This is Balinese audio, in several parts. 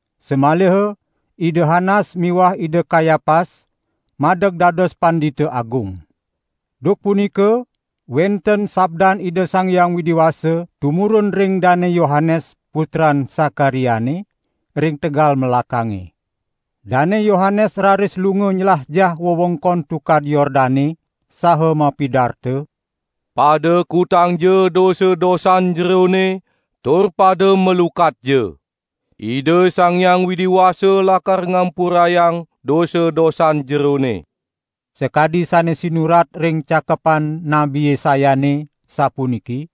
samaliha Ida Hanas miwah Ida Kayapas madeg dados Pandita Agung. Duk punika wenten sabdan Ida Sang Hyang Widi Wasa tumurun ring Dane Yohanes putran Sakariane, ring tegal melakange. Dane Yohanes raris lunga nylajah wewengkon Tukad Yordane, saha mapidarta: "Pada kutangja dosa-dosan jerone, tur pada malukatja! Ida Sang Hyang Widi Wasa lakar ngampurayang dosa-dosan jerone!" Sakadi sane sinurat ring Cakepan Nabi Yesayane, sapuniki: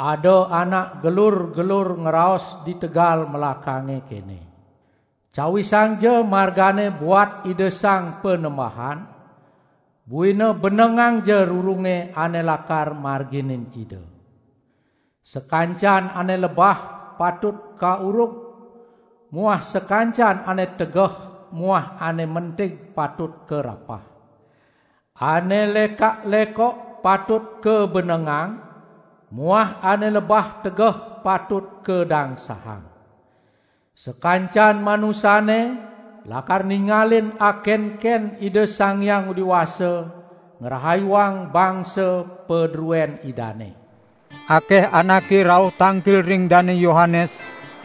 "Ada anak gelur-gelur ngraos di tegal melakange kene: Cawisangja margane buat Ida Sang Panembahan, buina benengangja rurunge ane lakar marganin Ida. Sakancan ane lebah patut kaurug muah sakancan ane tegeh muah ane mentig patut karapah. Ane lekak-lekok patut kabenengang muah ane lebah tegeh patut kadangsahang; sakancan manusane lakar ningalin akenken Ida Sang Hyang Widi Wasa ngrahayuang bangsa padruen Idane." Akeh anake rauh tangkil ring Dane Yohanes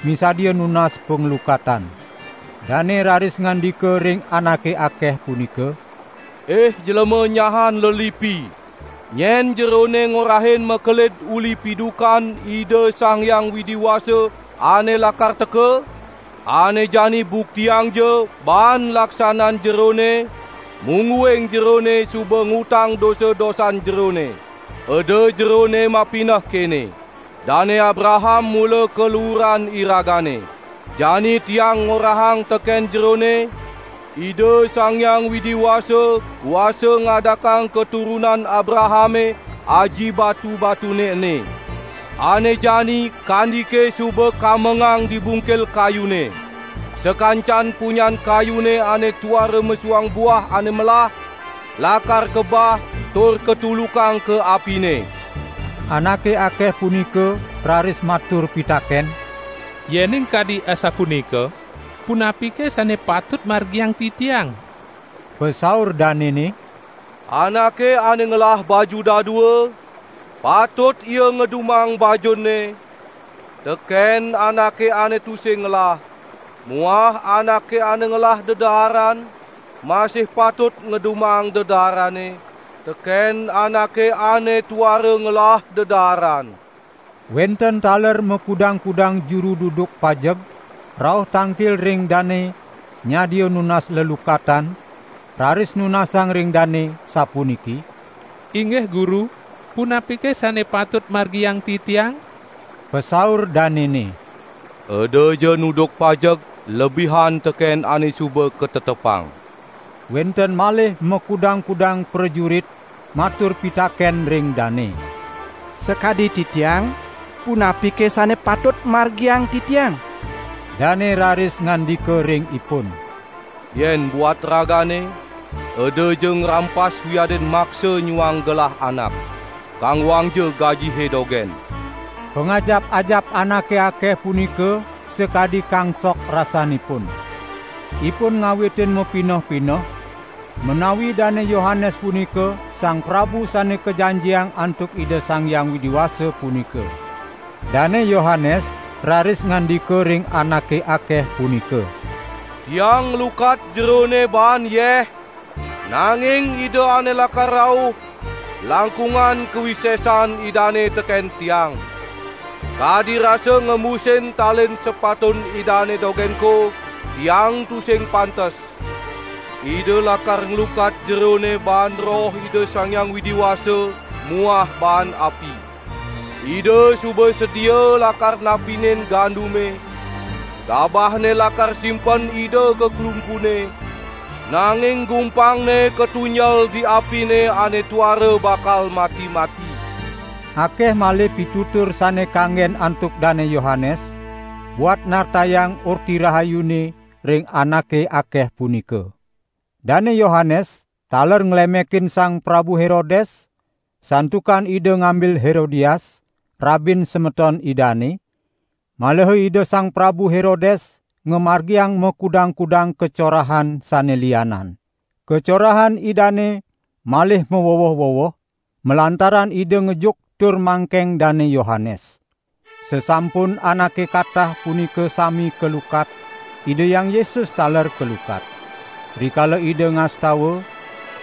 misadia nunas panglukatan. Dane raris ngandika ring anake akeh punika: "Ih jlema nyahan lelipi! Nyen jerone ngorahin makelid uli pidukan Ida Sang Hyang Widi Wasa ane lakar teka? Ane jani buktiangja baan laksanan jerone, mungguing jerone suba ngutang dosa-dosan jerone. Eda jerone mapineh kene: 'Dane Abraham mula kaluuran iragane.' Jani tiang ngorahang teken jerone, Ida Sang Hyang Widi Wasa kuasa ngadakang katurunan Abrahame aji batu-batune ene. Ane jani kandike suba kamengang di bungkil kayune. Sakancan punyan kayune ane tuara mesuang buah ane melah lakar kabah tur katulukang ka apine." Anake akeh punika raris matur pitaken: "Yening kadi asapunika, punapike sane patut margiang titiang?" Pasaur danene: "Anake ane ngelah baju dadua, patut ia ngedumang bajunne teken anake ane tusing ngelah muah anake ane ngelah dedaaran masih patut ngedumang dedaarane teken anake ane tuara ngelah dedaaran." Wenten taler makudang-kudang juru duduk pajeg rauh tangkil ring dane nyadia nunas lelukatan raris nunasang ring dane sapuniki: "Inggih guru, punapike sane patut margiang titiang?" Pasaur danene: "Edaja nuduk pajeg lebihan teken ane suba katetepang." Wenten malih makudang-kudang prajurit matur pitaken ring dane: "Sakadi titiang, punapike sane patut margiang titiang?" Dane raris ngandika ring ipun: "Yen buat ragane, edaja ngrampas wiadin maksa nyuang gelah anak. Kanggoangja gajihe dogen!" Pangajap-ajap anake akeh punika sakadi kangsok rasanipun. Ipun ngawitin mapineh-pineh, menawi Dane Yohanes punika Sang Prabu Sane Kajanjiang antuk Ida Sang Hyang Widi Wasa punika. Dane Yohanes raris ngandika ring anake akeh punika: "Tiang nglukat jerone baan yeh, nanging Ida ane lakar rauh, langkungan kawisesan Idane teken tiang. Kadi rasa ngembusin talin sepatun Idane dogenko tiang tusing pantes. Ida lakar nglukat jerone baan Roh Ida Sang Hyang Widi Wasa muah baan api. Ida suba sedia lakar napinin gandume, gabahne lakar simpen Ida ka klumpune, nanging gumpangne katunjel di apine ane tuara bakal mati-mati." Akeh malih pitutur sane kanggen antuk Dane Yohanes buat nartayang Orti Rahayune ring anake akeh punika. Dane Yohanes taler nglemekin Sang Prabu Herodes santukan ida ngambil Herodias, rabin semeton idane, maliha Ida Sang Prabu Herodes ngamargiang makudang-kudang kacorahan sane lianan. Kacorahan idane malih maweweh-weweh, malantaran ida ngejuk tur mangkeng Dane Yohanes. Sasampun anake katah punika sami kalukat, Ida Hyang Yesus taler kalukat. Rikala Ida ngastawa,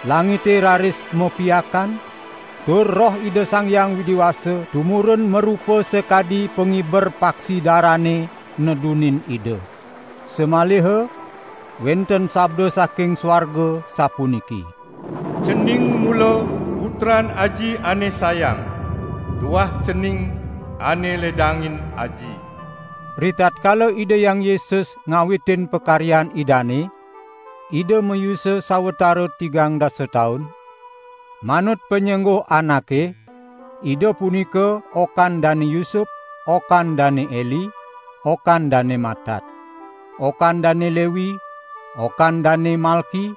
langite raris mapiakan, tur Roh Ida Sang Hyang Widi Wasa tumurun marupa sakadi pangiber paksi darane nedunin Ida. Samaliha wenten sabda saking suarga sapuniki: "Cening mula Putran Aji ane sayang. Tuah Cening ane ledangin Aji." Ritatkala Ida Hyang Yesus ngawitin pakaryan Idane, Ida mayusa sawatara tigang dasa taun; manut panyengguh anake, Ida punika okan Dane Yusup, okan Dane Eli, okan Dane Matat, okan Dane Lewi, okan Dane Malki,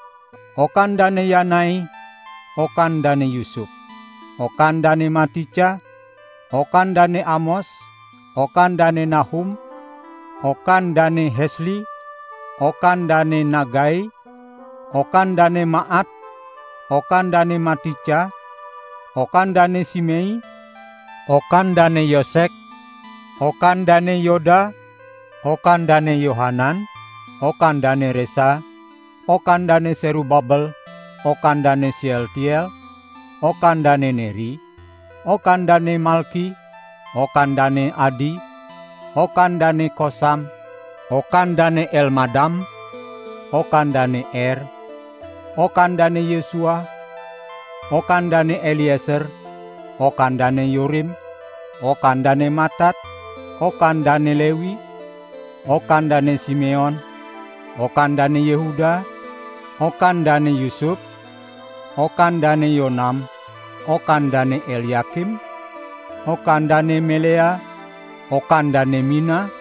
okan Dane Yanai, okan Dane Yusup, okan Dane Matica, okan Dane Amos, okan Dane Nahum, okan Dane Hesli, okan Dane Nagai, okan Dane Maat, okan Dane Matica, okan Dane Simei, okan Dane Yosek, okan Dane Yoda, okan Dane Yohanan, okan Dane Resa, okan Dane Serubabel, okan Dane Sealtiel, okan Dane Neri, okan Dane Malki, okan Dane Adi, okan Dane Kosam, okan Dane Elmadam, okan Dane Er, okan Dane Yesua, okan Dane Elieser, okan Dane Yorim, okan Dane Matat, okan Dane Lewi, okan Dane Simeon, okan Dane Yehuda, okan Dane Yusup, okan Dane Yonam, okan Dane Elyakim, okan Dane Melea, okan Dane Mina,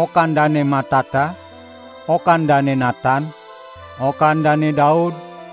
okan Dane Matata, okan Dane Natan, okan Dane Daud,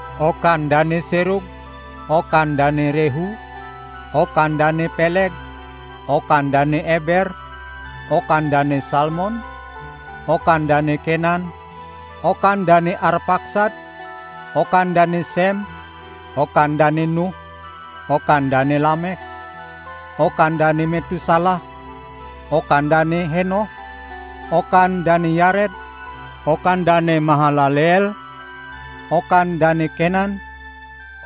okan Dane Serug, okan Dane Rehu, okan Dane Peleg, okan Dane Eber, okan Dane Salmon, okan Dane Kenan, okan Dane Arpaksad, okan Dane Sem, okan Dane Nuh, okan Dane Lameh, okan Dane Metusalah, okan Dane Henoh, okan Dane Yared, okan Dane Mahalaleel, okan Dane Kenan,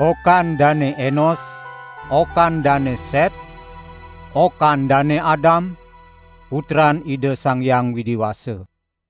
okan Dane Enos, okan Dane Set, okan Dane Adam, putran Ida Sang Hyang Widi Wasa.